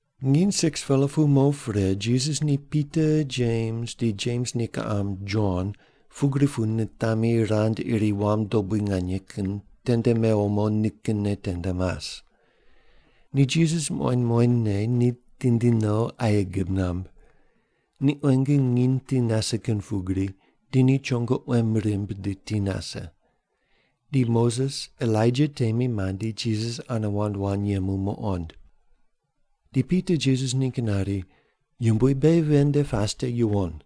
Nginy 6-pela pu mo pre Jisas ni Pita, Jems, di Jems ni kiqam Jon pugri pu nitami rand iri wam dobui nganye kin tende mewo mo nikinne tende mas. Ni Jisas muqoind muqoindne ni tindi no aye gib namb. Ni quenge nginy ti nase kin pugri, di ni chongo quem rimb di ti nase. Di Moses Elaija temi mandi Jisas ane wand wand yemu muqond. Di Pita Jisas ningg nari, “Yumbui, beghi ven nde pas te yuwon.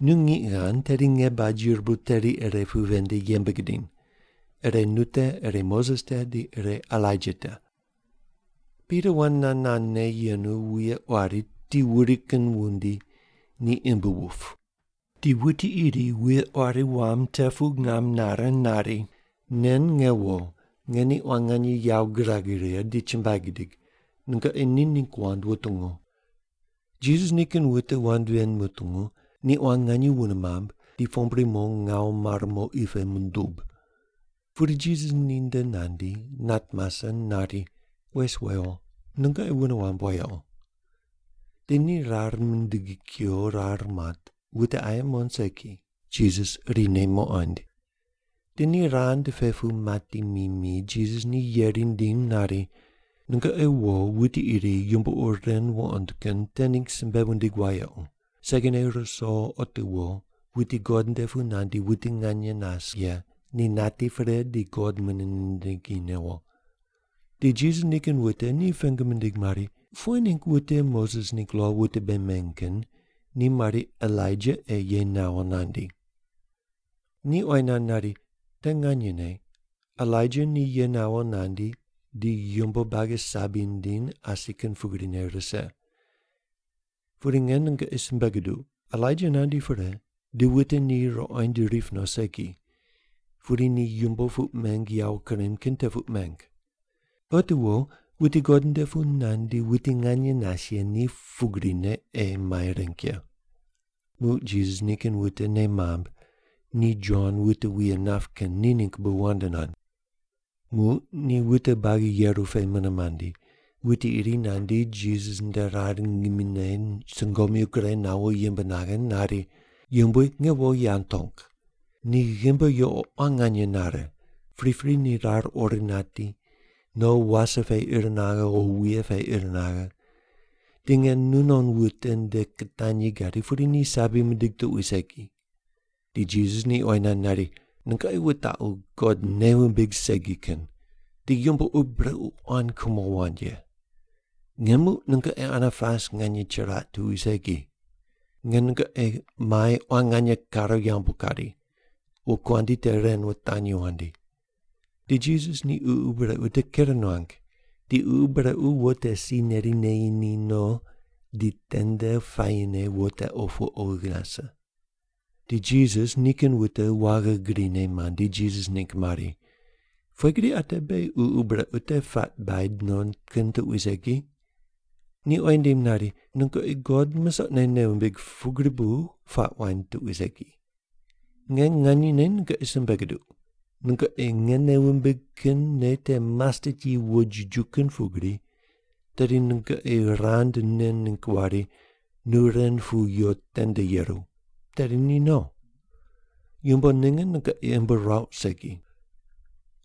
Nu ngiq ghand tedi nge baj yirbu teri ire pu ven nde yembe gidiny. Ire nu te, ire Moses te, di ire Elaija te.” Pita wand nand nandne yenu wuye quari ti wuri kin wundi ni imb wup, di wuti iri wuye quari wam te pu ngam nare nari, “Nen nge wo, nge ni quan nganye yawo girag righe di chumbuai gidig. Nungoqi ni ningg wand wutungu.” Jisas nikin wute wand ven mutungu, ni quan nganye wune mamb ni pombri mo ngawu mare mo qi pe mundub. Pudi Jisas ninde nandi, nat mase nari, “Wes wewo, nungoqi wune wamb wayequ.” Di ni rar mindigi kuyo rar mat, wute aye muqond segi, Jisas irine muqoind. Di ni rand pe pu mati mi mi, Jisas ni yeri nindim nari, “Nungoqi wo wuti iri yumbo ur ren wuqond kin te ningg simbe wundig wayequ, segine ruso otiwo wuti God nde pu nandi wuti nganye nas ye ni nati pre di God mune nindingi newo.” Di Jisas nikin wute ni pengu mindig mari, “Pughe ningg wute Moses ningg lo wute bei meny kin ni mari Elaija ei ye nawo nandi?” Ni oyi nand nari, “Te nganyene Elaija ni ye nawo nandi di yumbo buagi sabi nindiny asi kin pugrine rise. Pudi nge nungoqi simbe guduq, Elaija nandi pre, di wute ni ruqoind rip no segi, pudi ni yumbo puq meng yawo kurem kin te puq meng. Otiwo wuti God nde pu nandi wuti nganye nas ye ni pugrine ei mai reng ye.” Muq Jisas nikin wute nei mamb ni Jon wute wuye nap kin ni ningg bu wand nand. Muq ni wute buagi yeru pe mune mandi, wuti iri nandi Jisas nde rar ngimine sungomyu gure nawo yimb naghe nari, “Yumbui, nge wo yawo tong. Ni ghimbi yuqo quan nganye nare, pripri ni rar ori nati, no wase pe ir naghe o wuye pe ir naghe. Di nge nunon wute nde kitanyi gadi, pudi ni sabi mindig tuqui segi.” Di Jisas ni oyi nand nari, “Nungoqi wutaqu God nei wumbig segi kin, di yumbo ur brequ quan kumo wand ye. Nge muq nungoqi ane pas nganye chiraq tuqui segi. Nge nungoqi mai quan nganye kare yambu kari. Wokuandi te ren wutanyi wandi.” Di Jisas ni ququ brequ te ker nuang, di ququ brequ wo te si neri neyi ni no, di tende puayine wo te opu oghi nase. Di Jisas nikin wute waghi grine mandi, Jisas ningg mari, “Pughe gri ate beghi ququ brequ te puaq baid no kin tuqui segi?” Ni oyi nindim nari, “Nungoqi God musoqne nei wumbig pugri bu puaq waind tuqui segi. Nge nganyene nungoqi simbe guduq, nungoqi nge nei wumbigh kin nei te mastet yi wojiju kin pugri, tedi nungoqi rand nen ningg wari, ‘Nu ren pu yo tende yeru,’ tedi ni no. Yumbo ninge nungoqi imb ruauq segi.”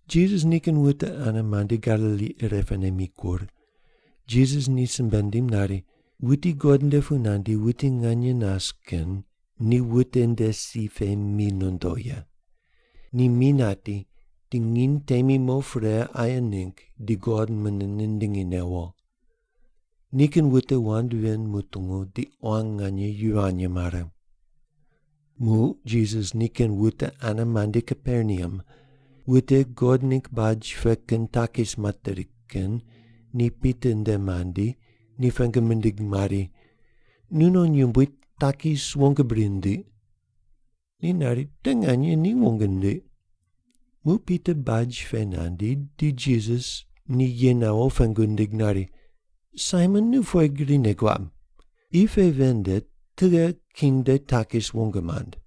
Jisas nikin wute ane mandi Galili irepene mikur, Jisas ni simbe nindim nari, “Wuti God nde pu nandi wuti nganye nas kin ni wute nde si pe mi nondo ye. Ni mi nati, di nginy temi mo pre aye ningg di God mune nindingi newo.” Nikin wute wand ven mutungu di quan nganye yivany mare. Muq Jisas nikin wute ane mandi Kaperneam, wute God ningg baj pe kin takis materi kin ni Pita nde mandi ni pengu mindig mari, “Nu non yumbui takis wong bri nindiq?” Ni nari, “Te nganye ni wong nindiq.” Muq Pita baj pe nandi di Jisas ni ye nawo pengu nindig nari, “Saimon, nu pughe gri nei guab? Qi pe ven nde tughe king nde takis wong mand?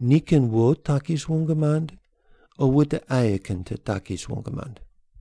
Ni kin wo takis wong mand, o wute aye kin te takis wong mand?”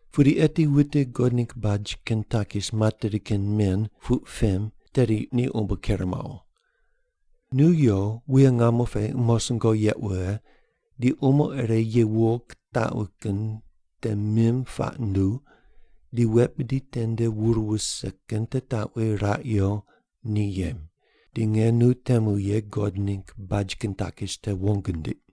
Pudi eti wute God ningg baj kin takis materi kin men puq pem tedi ni umbo ker mawo. Nu yo, wuye ngamo pe umosungo yeq wughe, di umo ire ye wuwo kutaqwi kin te mim puaq nduw, di wet bidi tende wur wuse kin te taqwi raq yo ni yem, di nge nu temu ye God ningg baj kin takis te wong ndiq.”